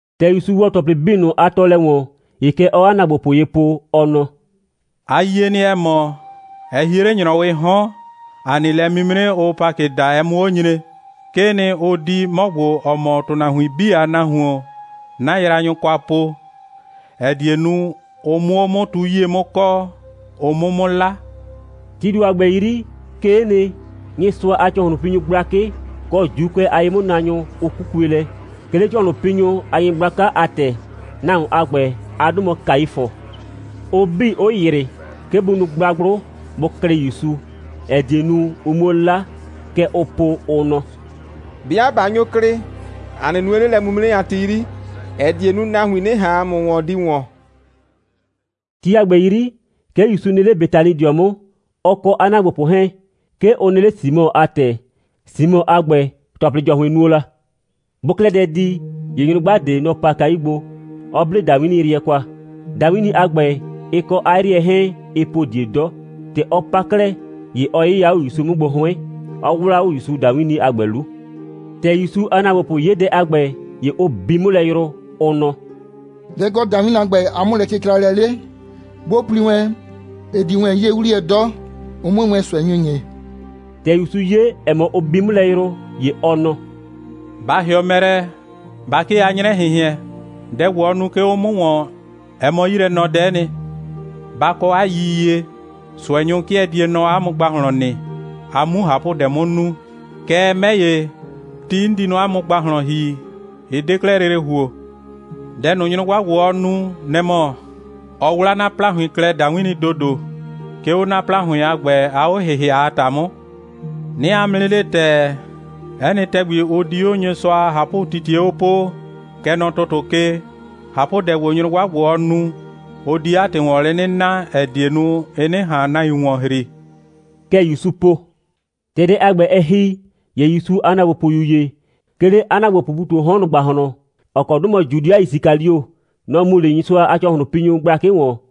‑Tɛ ‑Yusu ‑wɔ ‑tɔplɩ 'bii ꞊nʋ a tɔɔlɛ ‑wɔn, ‑ye kɛ ɔɔ 'a ‑naagbopʋ ye po, ɔ nɔ: «A yie nɩ, ‑ɛ mɔ, ɛ hie 'le ‑nyrɔwɩɩ 'hɔn, ‑a nɩ lɛ'mimre, ʋʋ Pakɩ daa, ɛ 'mʋ 'o nyre. 'Kee nɩ, ʋ di 'mɔ ‑gbo, ‑ɔ mɔ ‑tʋnahuin 'bii a Nahuon 'na yraanyʋ kwa po, ‑ɛ die nu, ʋ 'mʋ 'o 'mʋ tu 'yie 'mʋ kɔɔ, ʋ 'mʋ 'mʋ 'la.» Tii ‑do a ‑gbɛ 'yri, 'kee nɩ, Nyɩsʋa a ‑cɔhlʋnpinyʋ gblakɩ, kɔ ‑Juukʋɛ a ye'mʋnaanyʋ, ʋ 'kukue lɛ, 'ke 'le ‑cɔhlʋnpinyʋ a nyɩgblaka a ‑tɛ. Nahuon a ‑gbɛ a 'dʋ mɔ Kaifʋ; ʋ 'bii, 'ʋ ‑yrɩ, 'ke bʋ nu gblagblʋ, bʋ klɩ ‑Yusu, ‑ɛ die nu, ʋ 'muo 'la. Kɛ ʋʋ po, ʋ nɔ: «'Bɩa ꞊ba nyo klɩ, ‑a 'nɩ nue 'le lɛ'mimre a ti 'yri, ‑ɛ die nu, nahuin 'nɩ ꞊han ‑a mʋ ‑wɔn di ‑wɔn.» Ti a ‑gbɛ 'yri, 'ke ‑Yusu nɩ 'le Betanidɩɔ 'mʋ, ɔ kɔ 'a ‑naagbopʋ 'hɛɛn. 'Ke ʋ nɩ 'le Simɔ a ‑tɛ. Simɔ a ‑gbɛ, ‑tɔplɩ ‑jɔhʋɩn nuo la. Bʋʋ 'klɛɛ dɛ di, ‑ye nyrʋgba ꞊de, nɔ‑ pa kayu gbo, 'ɔ 'ble ‑dawinniyrɩɛ kwa. ‑Dawinni a ‑gbɛ, ɩ kɔ 'a 'yrɩɛ 'hɛɛn, ɩɩ po ꞊die 'dɔ. ‑Tɛ ɔ pa 'klɛɛ, ‑ye ɔ 'yɩya 'o ‑Yusu 'mʋ gbo 'hʋɩn, 'ɔ 'wlaa 'o ‑Yusu ‑dawinni a ‑gbɛ 'lu. ‑Tɛ ‑Yusu a ‑naagbopʋ 'ye dɛ a ‑gbɛ, ‑ye ʋ bi 'mʋ lɛ yrʋ, ʋ nɔ: «Dɛ‑ kɔ ‑dawinni a ‑gbɛ a 'mʋlɛcɩcralɛ 'le? 'Bʋ pli wɛn, ɩ di wɛn 'ye 'wliyɛ 'dɔ, ʋ 'mue wɛn ꞊sʋɛnyʋ ‑nyi.» ‑Tɛ ‑Yusu 'ye, ‑ɛ mɔ, ʋ bi 'mʋ lɛ yrʋ, ‑ye ɔ nɔ: «Ba ‑hɩɔ mɛ lɛ, ba 'kee 'a 'nyrɛ꞊hɩnhɩɛn! Dɛ ‑gbo, ɔ nu, 'ke 'o 'mʋ ‑wɔn, ɛ mɔ 'yilɛnɔdɛ'ɛ nɩ. Ba kɔ 'a yiyie, ꞊sʋɛnyʋ 'kɩɛ die nɔ 'a mʋ ‑gbahlɔn nɩ, a 'mu ꞊hapʋdɛ 'mʋ nu. Kɛɛ, 'mɛ ‑ye, ti 'n di nɔ 'a mʋ ‑gbahlɔn ‑hi, ɩ 'de 'klɛɛ lele ‑huo. Dɛ ꞊nʋ, nyrʋgba ‑gbo, ɔ nu, nɛ‑ mɔ: ɔ 'wlaa 'na ‑plahʋɩn klɛ ‑dawinni ‑dodo, 'ke 'o 'na ‑plahʋɩn a ‑gbɛ a 'o‑hɩhɩa a ‑ta 'mʋ. 'Nɩɩ 'a mʋ 'nɩ le ‑tɛɛ, 'ɛ nɩ ‑tɛgbi, ʋ di 'o Nyɩsʋa a ꞊hapʋtitie 'o poo, kɛ nɔ ‑tʋtʋ ke, ꞊hapʋdɛ ‑gbo, nyrʋgba ‑gbo, ɔ nu, ʋ di 'a ‑tɩ ‑wɔn lɛ 'nɩ na, ‑ɛ die nu, ɩ 'nɩ ꞊han nahuin ‑wɔn ‑hri.» Kɛ ‑Yusu po. ‑Tɛ dɛ a ‑gbɛ, ɛ ‑hi, ‑ye ‑Yusu a ‑naagbopʋyu ‑ye, 'ke 'le 'a ‑naagbopʋʋ ‑pu ꞊tu 'o 'hɔn ꞊nʋ ‑gbahlɔn, ‑ɔ kɔ 'dʋ mɔ Judɩa Yisikalio, nɔ‑ mu 'le Nyɩsʋa a ‑cɔhlʋnpinyʋ gblakɩ ‑wɔn,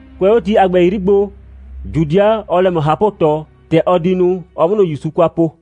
Kʋɛ 'o ti a ‑gbɛ 'yri gbo, Judɩa, ɔɔ lɛ ꞊mɔ ꞊hapʋ꞊tɔ, ‑tɛ ɔ di nu, ɔ 'mʋ ꞊nʋ ‑Yusu kwa po.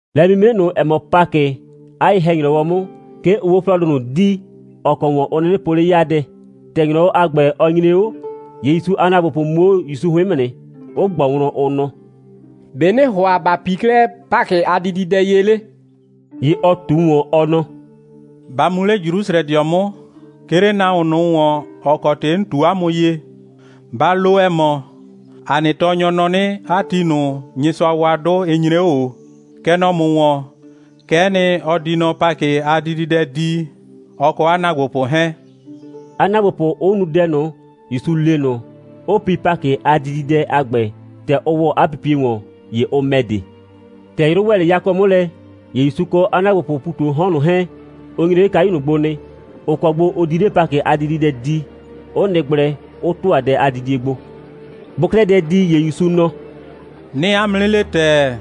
Lɛ'mimre ꞊nʋ, ‑ɛ mɔ Pakɩ, 'a ye‑hɛ‑nyrɔwɔ 'mʋ, 'ke ʋʋ 'o 'flɔɔdʋ ꞊nʋ dii, ‑ɔ kɔ ‑wɔn ʋ 'nɩnɩ po 'le 'yaadɛ. ‑Tɛ ‑nyrɔwɔ a ‑gbɛ, ɔ nyre 'o, ‑ye ‑Yusu a ‑naagbopʋ mu 'o ‑Yusu 'hʋɩn 'mʋ nɩ, 'ʋ ꞊gbɔ wlɔn, ʋ nɔ: «‑Be' ‑nɩɩ ‑hʋa ‑ba pii 'klɛɛ Pakɩ a dididɛ ye 'le?» ‑Ye ɔ ꞊tu ‑wɔn, ɔ nɔ: «Ba mu 'le Jrusrɛdɩɔ 'mʋ, 'ke 'le nahuon ꞊nʋ ‑wɔn, ‑ɔ kɔ ‑tɩ 'n ꞊tu 'a mʋ ye, ba lo, ‑ɛ mɔ: ‑A nɩ tɔɔnyɔ nɔ 'nɩ, 'a ti ꞊nʋ, Nyɩsʋa wa 'dʋ, ɩ nyre 'o ꞊o. Kɛ nɔ ‑mʋ ‑wɔn, kɛ'ɛ nɩ, ɔ di nɔ Pakɩ a dididɛ dii, ɔ kɔ 'a ‑naagbopʋ 'hɛɛn,» 'a ‑naagbopʋ 'ʋ nu dɛ ꞊nʋ, ‑Yusu le ꞊nʋ, 'ʋ pi Pakɩ a dididɛ a ‑gbɛ. ‑Tɛ ʋ ‑wɔ 'a pipie ‑wɔn, ‑ye ʋ ‑mɛ de. ‑Tɛ 'yrʋ ‑wɛ 'le yakɔ 'mʋ lɛ, ‑ye ‑Yusu kɔ 'a ‑naagbopʋʋ ‑pu ꞊tu 'o 'hɔn ꞊nʋ 'hɛɛn, ʋ nyre 'le kayu ꞊nʋ gbo nɩ, ‑ʋ kɔ gbo ʋ di 'le Pakɩ a dididɛ dii, 'ʋ nɩ gblɛ, 'ʋ ‑tʋa dɛ a didie gbo. Bʋʋ 'klɛɛ dɛ di, ‑ye ‑Yusu nɔ: «'Nɩɩ 'a mʋ 'nɩ le ‑tɛɛ,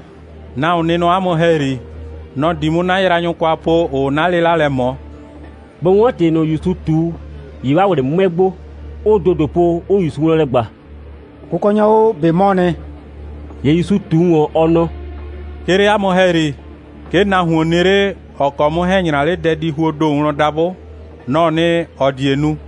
nahuon nɩ nɔ 'a mʋ ‑hɛyri. Nɔ‑ di 'mʋ 'na yraanyʋ kwa po, ‑ʋʋ 'na 'lɩla lɛ ꞊mɔ.» Bʋ 'wɔn ‑tɩ ꞊nʋ, ‑Yusu ꞊tu, ‑ye 'waa ꞊wlɩ 'mʋɛ gbo, 'ʋʋ ‑dodo po, 'ʋʋ ‑Yusu wlɔn lɛ ꞊gba: «Kʋkɔnyɔ o, ꞊be 'mɔɔ nɩ?» ‑Ye ‑Yusu ꞊tu ‑wɔn, ɔ nɔ: «'Ke 'le 'a mʋ ‑hɛyri, 'ke nahuon nɩ 'le, ‑ɔ kɔ 'mʋ 'hɛɛn‑ 'nyra 'le dɛdihuoo ‑do wlɔn dabʋ. Nɔ‑ɔ nɩ, ‑ɔ die nu.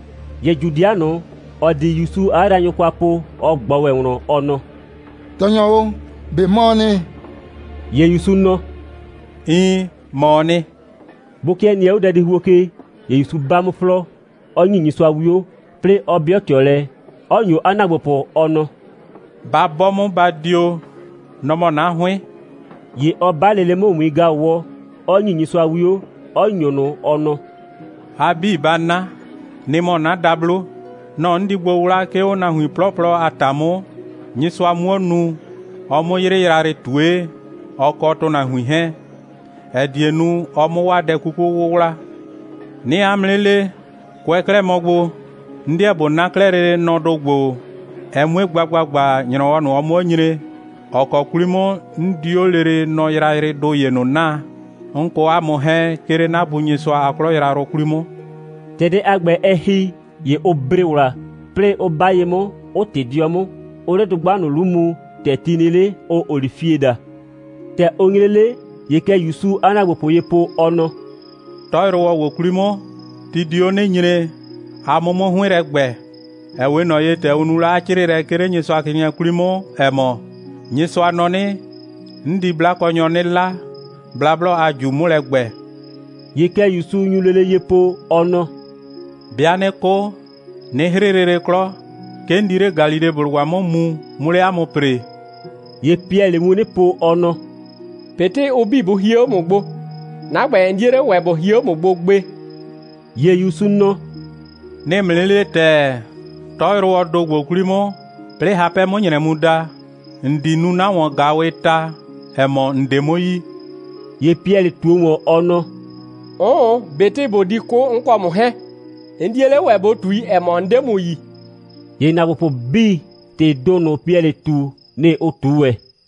‑Ye Judɩa ꞊nʋ, ‑ɔ di ‑Yusu 'a yraanyʋ kwa po, ɔ ꞊gbɔ ‑wɛ wlɔn, ɔ nɔ: «Tɔɔnyɔ o, ꞊be 'mɔɔ nɩ?» ‑Ye ‑Yusu nɔ: «Iin, ‑mɔɔ nɩ.» Bʋ 'kɩɛ nɩɛ 'o dɛdihuo ke, ‑ye ‑Yusu 'ba 'mʋ 'flɔɔ, 'ɔ ‑nyi Nyɩsʋa 'wio, 'plɩɩ 'ɔ 'bɩɔ ꞊tɩɔ lɛ, 'ɔ ‑nyo 'a ‑naagbopʋ, ɔ nɔ: «Ba 'bɔ 'mʋ, ba dio. Nɔ‑ mɔ 'na 'hʋɩn.» ‑Ye ɔ 'ba lele 'mʋ ‑wiin‑gaʋwɔ, 'ɔ ‑nyi Nyɩsʋa 'wio, 'ɔ ‑nyo ꞊nʋ, ɔ nɔ: «A 'bii, ba 'na. Nɩ‑ mɔ 'na dablo. Nɔ‑ 'n di gbo 'wla, 'ke 'o nahuin 'plɔplɔ a ‑ta 'mʋ, Nyɩsʋa 'muo nu, ɔ 'mʋ 'yrɩ yrayrɩ ꞊tue, ɔ kɔ ‑tʋnahuin 'hɛɛn, ‑ɛ die nu, ɔ 'mʋ 'waa dɛ 'kuku 'wʋwla. 'Nɩɩ 'a mʋ 'nɩ le, kʋɛ 'klɛɛ mɔ gbo, 'n 'deɛ ꞊bo 'na 'klɛɛ lele nɔdʋ ‑gbo, ɛ 'mue gba ‑gbagba, ‑nyrɔwɔ ꞊nʋ, ɔ 'mʋ 'o nyre, ‑ɔ kɔ 'kwli 'mʋ 'n di 'o lele nɔ yrayrɩdʋ ‑ye ꞊nʋ 'naa, 'n kɔ 'a mʋ 'hɛɛn, 'ke 'le 'na Bu Nyɩsʋa a 'klɔ yrayrʋ 'kwli 'mʋ.» Dɛ a ‑gbɛ, ‑tɛ ɛ ‑hi, ‑ye ʋ bre ‑wla, 'plɩɩ 'ʋ 'ba ye 'mʋ, 'ʋ ꞊tɩ 'dɩɔ 'mʋ, 'ʋʋ 'le dʋgba ꞊nʋ 'lu mu, ‑tɛ ti nɩ 'le, ʋʋ olifie daa. ‑Tɛ ʋ nyre 'le, ‑ye kɛ ‑Yusuu 'a ‑naagbopʋ ye po, ɔ nɔ: «'Tɔyrʋwɔ ‑gbo 'kwli 'mʋ, ti di 'o 'nɩ nyre, a 'mʋ 'mʋ 'hʋɩn 'mʋ lɛ ‑gbɛ, ‑ɛ 'we ꞊nɔ ye, ‑tɛ ʋ nu la 'a 'crɩɩlɛ, 'ke 'le Nyɩsʋacrɩɩnɩɛ 'kwli 'mʋ, ‑ɛ mɔ: Nyɩsʋa nɔ 'nɩ: 'N di 'blakɔnyɔ 'nɩ 'la, blablɔ a ꞊ju 'mʋ lɛ ‑gbɛ.» ‑Ye kɛ ‑Yusu nyu lele ye po, ɔ nɔ: «'Bɩa 'nɩ 'kʋ, 'nɩ 'hrɩ lele 'klɔ, 'ke 'n di 'le Galileblʋgba 'mʋ mu, 'mʋ 'le 'a mʋ ‑pree.» ‑Ye Piɛlɩɩ wun 'nɩ po, ɔ nɔ: «꞊Betɩ ʋ 'bii bʋ hie 'o ‑mʋ gbo, 'na ‑gbɛ, 'n 'die 'le ‑wɛ ꞊bo hie 'o ‑mʋ gbo gbe.» ‑Ye ‑Yusu nɔ: «'Nɩɩ ‑mʋ 'nɩ le ‑tɛɛ: 'Tɔyrʋwɔɔ ‑do ‑gbo 'kwli 'mʋ, 'plɩɩ hapɛ 'mʋ ‑nyrɛ mu da, ‑n di nu 'na ‑wɔn‑gaawɩɩ ta, ‑ɛ mɔ, ‑n 'de 'mʋ yi.» ‑Ye Piɛlɩ ꞊tuo ‑wɔn, ɔ nɔ: «'Ʋʋn, ꞊betɩ ꞊bo di 'kʋ, 'n kɔ ‑mʋ 'hɛɛn, 'n 'die 'le ‑wɛ ꞊bo ꞊tui, ‑ɛ mɔ, 'n 'de ‑mʋ yi.» ‑Ye ‑naagbopʋ 'bii, ‑tɩɩ ‑do ꞊nʋ, Piɛlɩ ꞊tu, nɩ‑ ʋ ꞊tu ‑wɛ.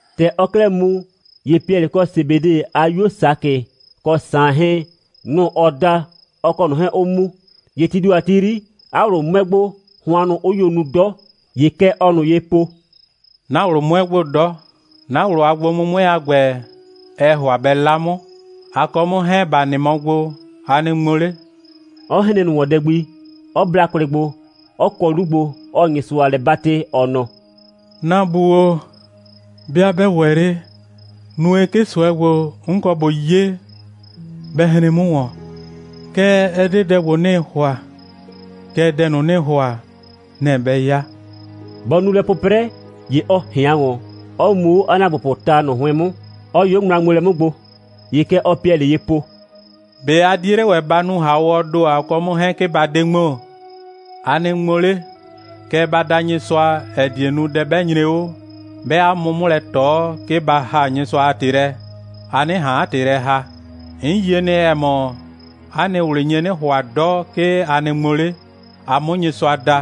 ‑Tɛ ɔɔ 'klɛɛ mu, ‑ye Piɛlɩ kɔ Sebede a 'yuo Sakɩ kɔ Saan 'hɛɛn, nʋ‑ ɔ da, ɔ kɔ ꞊nʋ 'hɛɛn 'ʋ mu. ‑Ye tii ‑do a ti 'yri, 'a ꞊wlʋ 'mʋɛ gbo, hʋannʋ 'ʋ nyo nu 'dɔ. ‑Ye kɛ ɔɔ ꞊nʋ ye po: «'Na ꞊wlʋ 'mʋɛ gbo 'dɔ. 'Na ꞊wlʋ a gbo'mʋmʋɛ a ‑gbɛ, ɛɛ ‑hʋa bɛ 'la 'mʋ. A kɔ 'mʋ 'hɛɛn, ‑ba nɩ mɔ gbo, a nɩ ŋmo 'le,» 'ɔ hren ꞊nʋ ‑wɔn dɛ gbi, 'ɔ bla kwlɩ gbo, 'ɔ kɔ 'lu gbo, 'ɔɔ Nyɩsʋa lɛ 'batɩ, ɔ nɔ: «'Na Bu o, 'bɩa 'bɛ ‑wɛ 'le, nue, 'ke ꞊sʋɛ ‑gbo, 'n kɔ ꞊bo 'ye, bɛ hren 'mʋ ‑wɔn. Kɛɛ, ɛ 'de dɛ ‑gbo, 'nɩɩ ‑hʋa, kɛɛ, dɛ ꞊nʋ, ‑nɩɩ ‑hʋa, nɛ‑ bɛ 'ya.» Bɔ nu lɛ 'pʋprɛ, ‑ye ɔ ꞊hɩan ‑wɔn, 'ɔ mu 'o 'a ‑naagbopʋʋ ta ꞊nʋ 'hʋɩn 'mʋ, 'ɔ yʋ 'o ŋmla a ŋmoolɛ 'mʋ gbo. ‑Ye kɛ ɔɔ Piɛlɩ ye po: «꞊Be a 'die 'le ‑wɛ ba nu ‑hawɔɔ ‑do, a kɔ 'mʋ 'hɛɛn, 'ke ba 'de ŋmo? A nɩ ŋmo 'le, kɛɛ, ba da Nyɩsʋa, ‑ɛ die nu, dɛ 'bɛ nyre 'o, 'bɛɛ 'a mʋ 'mʋ lɛ ꞊tɔ, 'ke ba ‑haa Nyɩsʋa a ‑tɩ lɛ, a 'nɩ ꞊han 'a ‑tɩ lɛ ‑haa. 'N yie nɩ, ‑ɛ mɔ, 'a nɩ ꞊wlɩ nye 'nɩ ‑hʋa 'dɔ, 'ke a nɩ ŋmo 'le, a 'mʋ Nyɩsʋa da,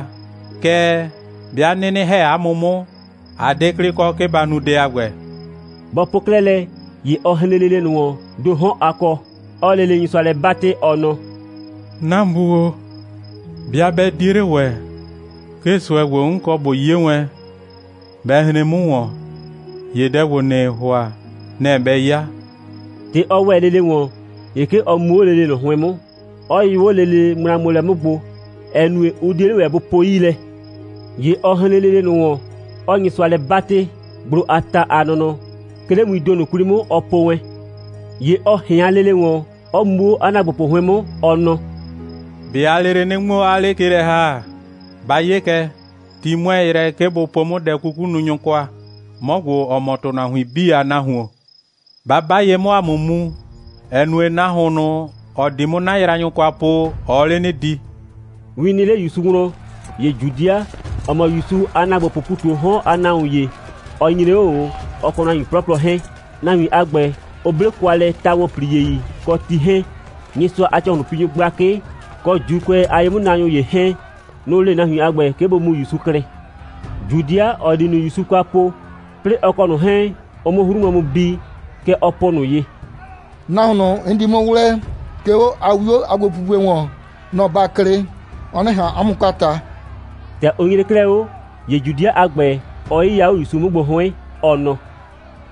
kɛɛ, 'bɩa 'nɩnɩ ‑hɛ 'a mʋ 'mʋ, a 'de 'klɩ kɔ, 'ke ba nu dɛ a ‑gbɛ.» Bɔ po 'klɛɛ lɛ, ‑ye ɔ hren lele ꞊nʋ ‑wɔn, ‑do 'hɔn a kɔ, 'ɔɔ lele Nyɩsʋa lɛ 'batɩ, ɔ nɔ: «'Na Bu o, 'bɩa 'bɛ 'die 'le ‑wɛ, 'ke ꞊sʋɛ ‑gbo, 'n kɔ ꞊bo 'ye wɛn, bɛ hren 'mʋ ‑wɔn, ‑ye dɛ ‑gbo, ‑nɩɩ ‑hʋa, nɛ‑ bɛ 'ya.» ‑Tɛ ɔ ‑wɛ lele ‑wɔn, ‑ye 'ke ɔ mu 'o lele ꞊nʋ 'hʋɩn 'mʋ, 'ɔ yʋ 'o lele ŋmlaŋmoolɛ 'mʋ gbo, ‑ɛ nue, ʋ 'die 'le ‑wɛ, bʋ po 'yii lɛ. ‑Ye ɔ hren lele ꞊nʋ ‑wɔn, 'ɔɔ Nyɩsʋa lɛ 'batɩ, gblo a ta a nɔnɔ, 'ke 'le wiin ‑do ꞊nʋ 'kwli 'mʋ, ɔ po wɛn. ‑Ye ɔ ꞊hɩan lele ‑wɔn, 'ɔ mu 'o 'a ‑naagbopʋ 'hʋɩn 'mʋ, ɔ nɔ: «꞊Be aa lele 'nɩ ŋmo, 'aa 'le ke lɛ ‑ha? Ba 'ye kɛ, ti 'mʋɛɛ yrɛ, 'ke bʋ po 'mʋ dɛ'kukununyʋ kwa, 'mɔ ‑gbo, ‑ɔ mɔ ‑tʋnahuin 'bii a Nahuon. Ba 'ba ye 'mʋ, ‑a 'mʋ mu, ‑ɛ nue, nahuon ꞊nʋ, ‑ɔ di 'mʋ 'na yraanyʋ kwa po, ɔɔ 'le 'nɩ di.» Win nɩ 'le ‑Yusu wlɔn, ‑ye Judɩa, ‑ɔ mɔ ‑Yusu a ‑naagbopʋʋ ‑pu ꞊tu 'o 'hɔn a nahuon ‑ye, ɔ nyre 'o ꞊o, ɔ kɔ nahuin 'plɔplɔ 'hɛɛn. Nahuin a ‑gbɛ, ʋ 'ble kwa lɛ ta‑wɔnpliei kɔ ti 'hɛɛn. Nyɩsʋa a ‑cɔhlʋnpinyʋ gblakɩ, kɔ ‑Juukʋɛ a ye'mʋnaanyʋ ‑ye 'hɛɛn, nʋ‑ le nahuin a ‑gbɛ, 'ke bʋ mu ‑Yusu klɩ. Judɩa, ‑ɔ di ꞊nʋ ‑Yusu kwa po, 'plɩɩ ɔ kɔ ꞊nʋ 'hɛɛn, ʋ 'mʋ 'hru wlɔn mu bi, kɛ ɔ po ꞊nʋ ye: «Nahuon ꞊nʋ, 'n di 'mʋ 'wlɛɛ, 'ke 'o 'a 'wio a gbopupue ‑wɔn, nɔ‑ ba klɩ, ɔ 'nɩ ꞊han 'a mʋ kwa ꞊ta.» ‑Tɛ ʋ nyre 'klɛɛ 'o, ‑ye Judɩa a ‑gbɛ, ɔ 'yɩya 'o ‑Yusu 'mʋ gbo 'hʋɩn, ɔ nɔ: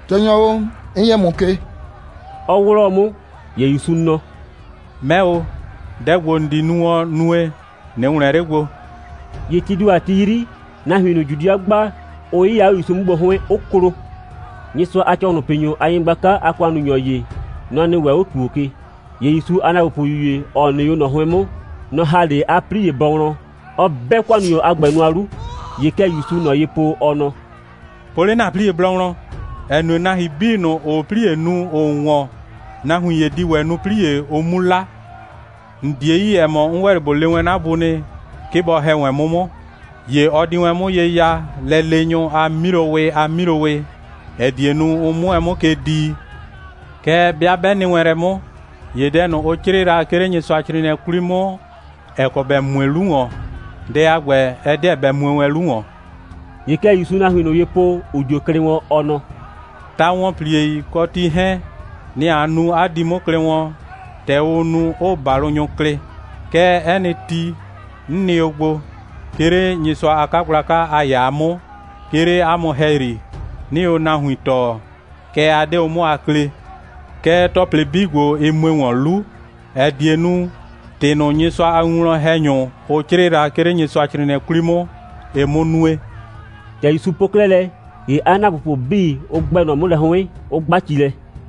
«Tɔɔnyɔ o, 'n yɛ ‑mʋ ke,» 'ɔ 'wlɔɔ 'mʋ. ‑Ye ‑Yusu nɔ: «'Mɛ o, dɛ ‑gbo, ‑n di nu wɔn, nue, ꞊nɩ ‑wlɛn 'le gbo.» ‑Ye tii ‑do a ti 'yri, nahuin ꞊nʋ, Judɩa gba, ʋ 'yɩya 'o ‑Yusu 'mʋ gbo 'hʋɩn, 'ʋ klo. Nyɩsʋa a ‑cɔhlʋnpinyʋ a nyɩgblaka a ‑kʋannunyɔ ‑ye, nɔ‑ nɩ ‑wɛ 'o ‑tuo ke. ‑Ye ‑Yusu a ‑naagbopʋyu ‑ye, ‑ɔ nɩ 'o ꞊nɔ 'hʋɩn 'mʋ, nɔ‑ ‑ha 'le 'a 'plie bɔ wlɔn, 'ɔ 'bɛ ‑kʋannunyɔ a ‑gbɛ nʋa 'lu. ‑Ye kɛ ‑Yusuu ꞊nɔ ye po, ɔ nɔ: «Po 'le ‑na 'plie bɔ wlɔn, ‑ɛ nue, nahuin 'bii ꞊nʋ, ‑ʋʋ 'plie nu, ‑ʋʋ ‑wɔn, nahuin ‑ye di ‑wɛ nu 'plie, ʋ 'mu 'la. ‑N 'die yi, ‑ɛ mɔ, 'n ‑wɛ 'le ꞊bo le wɛn 'na Bu nɩ, 'ke bɔ ‑hɛ wɛn 'mʋ 'mʋ, ‑ye ɔ di wɛn 'mʋ ye ya 'a lɛleenyʋ a 'milowɩ a 'milowɩ, ‑ɛ die nu, ʋ 'mʋ wɛn 'mʋ ke dii. Kɛɛ, 'bɩa 'bɛ nɩ wɛn lɛ 'mʋ, ‑ye dɛ ꞊nʋ, ʋ 'crɩɩ la, 'ke 'le Nyɩsʋacrɩɩnɩɛ 'kwli 'mʋ, ‑ɛ kɔ ‑bɛ mue la 'lu ‑wɔn, dɛ a ‑gbɛ, ɛ 'deɛ bɛ mue wɛn 'lu ‑wɔn.» ‑Ye kɛ ‑Yusuu nahuin ꞊nʋ ye po, ‑ʋ dio klɩ wɔn, ɔ nɔ: «Ta‑wɔnpliei kɔ ti 'hɛɛn, nɩ‑ a nu, 'a di 'mʋ klɩ wɔn, ‑tɛ ʋʋ nu, 'ʋʋ ‑balʋnyɔ klɩ. Kɛɛ, 'ɛ nɩ ti, 'n nɩ o gbo, 'ke 'le Nyɩsʋa a 'kagblaka a ‑yaa 'mʋ, 'ke 'le 'a mʋ ‑hɛyri, 'nɩɩ o nahuin tɔɔ, kɛɛ, 'a 'de o 'mʋ a klee. Kɛɛ, ‑tɔplɩ 'bii ‑gbo, ɩ mue ‑wɔn 'lu, ‑ɛ die nu, ‑tɩ ꞊nʋ, Nyɩsʋa a winwlɔn‑hɛnyʋ, ʋ 'crɩɩ la, 'ke 'le Nyɩsʋacrɩɩnɩɛ 'kwli 'mʋ, ɩ 'mʋ nue.» ‑Tɛ ‑Yusu po 'klɛɛ lɛ, ‑ye 'a ‑naagbopʋ 'bii, ʋ ‑gbɛ ꞊nɔ 'mʋ lɛ 'hʋɩn, 'ʋ 'gba ci lɛ.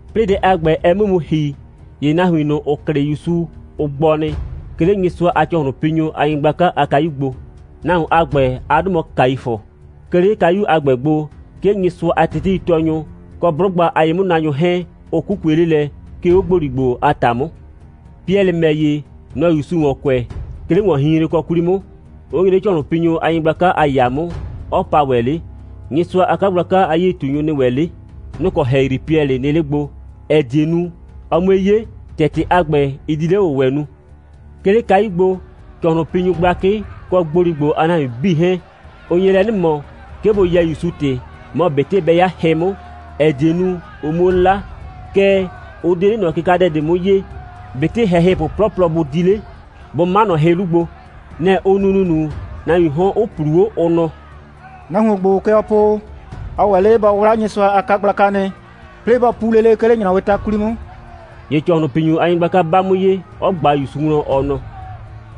'Plɩɩ dɛ a ‑gbɛ, ɛ 'mʋ mu ‑hi, ‑ye nahuin ꞊nʋ, ‑ʋ klɩ ‑Yusu, ʋ gbɔ nɩ, 'ke 'le Nyɩsʋa a ‑cɔhlʋnpinyʋ a nyɩgblaka a kayu gbo. Nahuon a ‑gbɛ a 'dʋ mɔ Kaifʋ. 'Ke 'le kayu a ‑gbɛ gbo, 'ke Nyɩsʋa a teteitɔɔnyʋ, kɔ 'blʋgba a ye'mʋnaanyʋ 'hɛɛn, ʋ 'kukue 'le lɛ, 'ke 'o ‑gboligbo a ‑ta 'mʋ. Piɛlɩ ‑mɛ ‑ye, nɔ‑ɔ ‑Yusu ‑wɔn kʋɛ, 'ke 'le ‑wɔnhinhrenkɔ 'kwli 'mʋ, 'ʋ nyre 'le ‑cɔhlʋnpinyʋ a nyɩgblaka a ‑yaa 'mʋ, 'ɔ pa ‑wɛ 'le. Nyɩsʋa a 'kagblaka a 'yie꞊tunyʋ nɩ ‑wɛ 'le. Nʋ‑ kɔ ‑hɛyri Piɛlɩ nɩ 'le gbo, ‑ɛ die nu, ɔ 'mue 'ye, ‑tɛ ‑tɩ a ‑gbɛ, ɩ di 'le‑wʋwɛ nu. 'Ke 'le kayu gbo, ‑cɔhlʋnpinyʋ gblakɩ kɔ ‑gboligbo a nahuin 'bii 'hɛɛn, ʋ nye lɛ 'nɩ ꞊mɔ, 'ke bʋ yɛɛ ‑Yusu ‑tɩ, mɔ ꞊betɩ bɛ 'ya hɩ 'mʋ, ‑ɛ die nu, ʋ 'muo 'la, kɛɛ, ʋ 'de 'le ꞊nɔ kɩkadɛ ꞊de 'mʋ 'yee, ꞊betɩ ‑hɛhɩpʋ 'plɔplɔ bʋ di 'le, bʋ 'ma ꞊nɔ hɩ 'lu gbo. Nɛ‑ ʋ nu ‑nunu, nahuiin 'hɔn 'ʋ ꞊plu 'o, ʋ nɔ: «Nahuon ‑gbo, kɛ ɔ po o, ɔ ‑wɛ 'le bɔ 'wla Nyɩsʋa a 'kagblaka nɩ, 'plɩɩ bɔ pu lele nɩ, 'ke 'le ‑nyrɔwɩɩ ta 'kwli 'mʋ.» ‑Ye ‑cɔhlʋnpinyʋ a nyɩgblaka 'ba 'mʋ ye, 'ɔ ꞊gba ‑Yusu wlɔn, ɔ nɔ: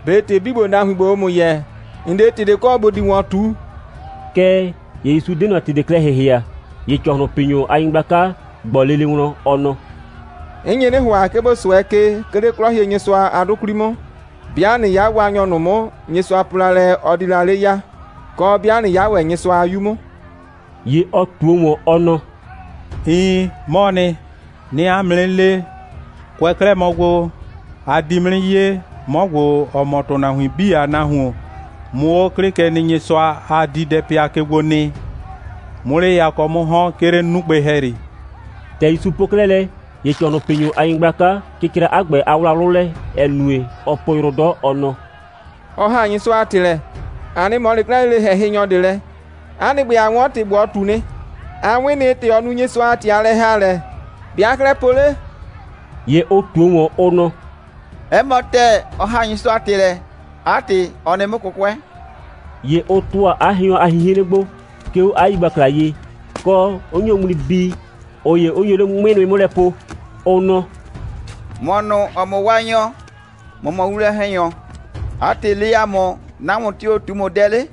«꞊Be ‑tɩ 'bii ‑gbo, nahuin ‑gbo, ʋʋ ‑mʋ yɛɛ, ‑n 'de ‑tɩ ꞊de kɔ, ‑bo di ‑wɔn ꞊tu?» Kɛɛ ‑ye ‑Yusu 'de ꞊nɔ ‑tɩ ꞊de klɛ ‑hɩhɩa. ‑Ye ‑cɔhlʋnpinyʋ a nyɩgblaka ꞊gbɔ lele wlɔn, ɔ nɔ: «'N nye 'nɩ ‑hʋa, 'ke ‑bo 'sʋɛ ke, 'ke 'le 'Klɔhienyɩsʋa a 'dʋ 'kwli 'mʋ, 'bɩa ꞊nɩ 'ya Waanyɔ ꞊nʋ 'mʋ, Nyɩsʋa po la lɛ, ɔ di la 'le ya, kɔ, 'bɩa ꞊nɩ 'ya ‑wɛ Nyɩsʋa a 'Yu 'mʋ.» ‑Ye ɔ ꞊tuo ‑wɔn, ɔ nɔ: «Iin, 'mɔɔ nɩ. 'Nɩɩ 'a mʋ 'nɩ le, kʋɛ 'klɛɛ mɔ gbo, a di 'mʋ 'nɩ 'ye, 'mɔ ‑gbo, ‑ɔ mɔ ‑tʋnahuin 'bii a Nahuon, 'mʋ 'o 'Klɩkenɩnyɩsʋa a diidɛpɩa ke gbo nɩ, 'mʋ 'le yakɔ 'mʋ ‑hɔn, 'ke 'le 'nugbɩ ‑hɛyri.» ‑Tɛ ‑Yusu po 'klɛɛ lɛ, ‑ye ‑cɔhlʋnpinyʋ a nyɩgblaka cɩcra 'a ‑gbɛ a wlawlʋ lɛ, ‑ɛ nue, ɔɔ po yrʋ 'dɔ, ɔ nɔ: «Ɔ ‑haa Nyɩsʋa a ‑tɩ lɛ. ‑A 'nɩ ꞊mɔ 'le 'klɛɛ lele ‑hɛhɩnyɔ ꞊de lɛ. 'A nɩ ‑gbɛ, a 'wɔn ‑tɩ ‑gbo, ɔ ꞊tu nɩ. A 'wɩn nɩ, ‑tɛ ɔ nu Nyɩsʋa a ‑tɩ a lɛ‑haalɛ. ‑Be' aa 'klɛɛ po 'le?» ‑Ye ʋ ꞊tuo ‑wɔn, ʋ nɔ: «'Ɛ mɔ ‑tɛɛ, ɔ ‑haa Nyɩsʋa a ‑tɩ lɛ. 'A ‑tɩ, ɔ nɩ 'mʋ 'kʋkʋɛ.» ‑Ye ʋ ‑tʋa 'a hɩɔn a 'hinhren gbo, 'ke 'o 'a yigbakla ye, kɔ, 'ʋ nyo ŋmli bii, ꞊ʋ ‑ye 'ʋ nyo 'le 'ŋmɩ nʋɩ 'mʋ lɛ po, ʋ nɔ: «‑Mɔ ꞊nʋ, ‑ɔ mɔ Waanyɔ, ‑mɔ mɔ winwlɔn‑hɛnyɔ. 'A ‑tɩ, le ‑a mʋ, nahuon tio‑ ꞊tu ‑mʋ dɛ 'le?»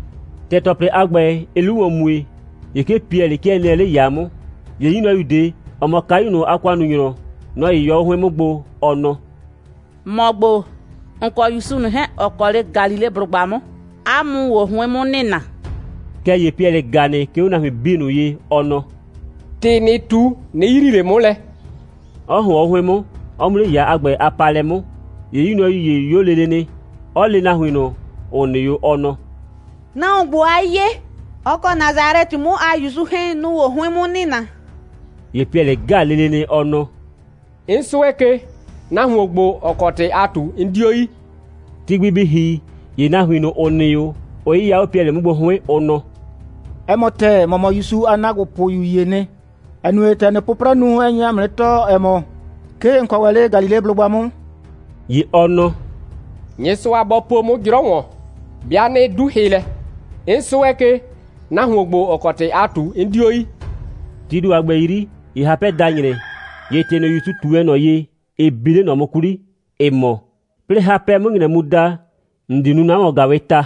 ‑Tɛ ‑tɔplɩ a ‑gbɛ, ɩɩ 'lu ‑wɔn mue, ‑ye 'ke Piɛlɩ 'kɩɛ nɩɛ 'le ‑yaa 'mʋ. ‑Ye 'yu nyrɔyu ꞊de, ‑ɔ mɔ kayu ꞊nʋ a ‑kʋannunyrɔ, nɔ‑ 'yɩyɔ 'o 'hʋɩn 'mʋ gbo, ɔ nɔ: «‑Mɔ ‑gbo, ‑n kɔ ‑Yusu ꞊nʋ 'hɛɛn, ‑ɔ kɔ 'le Galileblʋgba 'mʋ, 'a mʋ‑ʋ o 'hʋɩn 'mʋ nɩna.» Kɛɛ ‑ye Piɛlɩ ‑ga nɩ, 'ke 'o nahuin 'bii ꞊nʋ ye, ɔ nɔ: «‑Tɩ ‑nɩɩ ꞊tu, 'nɩ yrii ꞊le 'mʋ lɛ,» 'ɔ ‑hʋɔn 'o 'hʋɩn 'mʋ, 'ɔ mu 'le ‑yaa a ‑gbɛ a paalɛ 'mʋ. ‑Ye 'yu nyrɔyu ‑ye 'yo lele nɩ, 'ɔ le nahuin ꞊nʋ, ‑ʋ nɩ 'o, ɔ nɔ: «Nahuon ‑gbo, aa 'ye, ɔ kɔ Nasalɛtɩ 'mʋ a ‑Yusu 'hɛɛn, nʋ‑ʋ o 'hʋɩn 'mʋ nɩna.» ‑Ye Piɛlɩ ‑ga lele nɩ, ɔ nɔ: «'N 'sʋɛ ke, nahuon ‑gbo, ‑ɔ kɔ ‑tɩ aa ꞊tu, 'n 'dio yi.» Ti gbi bɩ ‑hi, ‑ye nahuin ꞊nʋ, ‑ʋ nɩ 'o, ʋ 'yɩya 'o Piɛlɩ 'mʋ gbo 'hʋɩn, ʋ nɔ: «'Ɛ mɔ ‑tɛɛ, ‑mɔ mɔ ‑Yusu a ‑naagbopʋyu ‑yee nɩ, ‑ɛ nue, ‑tɛ ‑nɩɩ 'pʋprɛ nu, ɛ nye ‑a mʋ 'nɩ tɔɔ, ‑ɛ mɔ, 'ke ‑n kɔ ‑wɛ 'le Galileblʋgba 'mʋ.» ‑Ye ɔ nɔ: «Nyɩsʋa bɔ po 'mʋ 'jrɔ ‑wɔn, 'bɩa 'nɩ 'du hɩ lɛ. 'N 'sʋɛ ke, nahuon ‑gbo, ‑ɔ kɔ ‑tɩ aa ꞊tu, 'n 'dio yi.» Tii ‑do a ‑gbɛ 'yri, ‑ye hapɛ da ‑nyrɛ. ‑Ye ‑tɩ ꞊nʋ, ‑Yusu ꞊tu wɛn ꞊nɔ ye, ɩ bi 'le ꞊nɔ 'mʋ 'kwli, ‑ɩ mɔ: «'Plɩɩ hapɛ 'mʋ ‑nyrɛ mu da, ‑n di nu 'na ‑wɔn‑gaawɩɩ ta,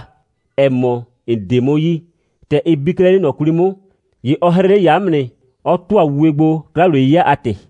‑ɛ mɔ, ‑n 'de 'mʋ yi.» ‑Tɛ ɩ bi 'klɛɛ 'le ꞊nɔ 'kwli 'mʋ, ‑ye ɔ 'hrɩ 'le ‑yaa 'mʋ nɩ, 'ɔ ‑tʋa wuwe gbo, 'kla‑wliye'yɩya a ‑tɩ.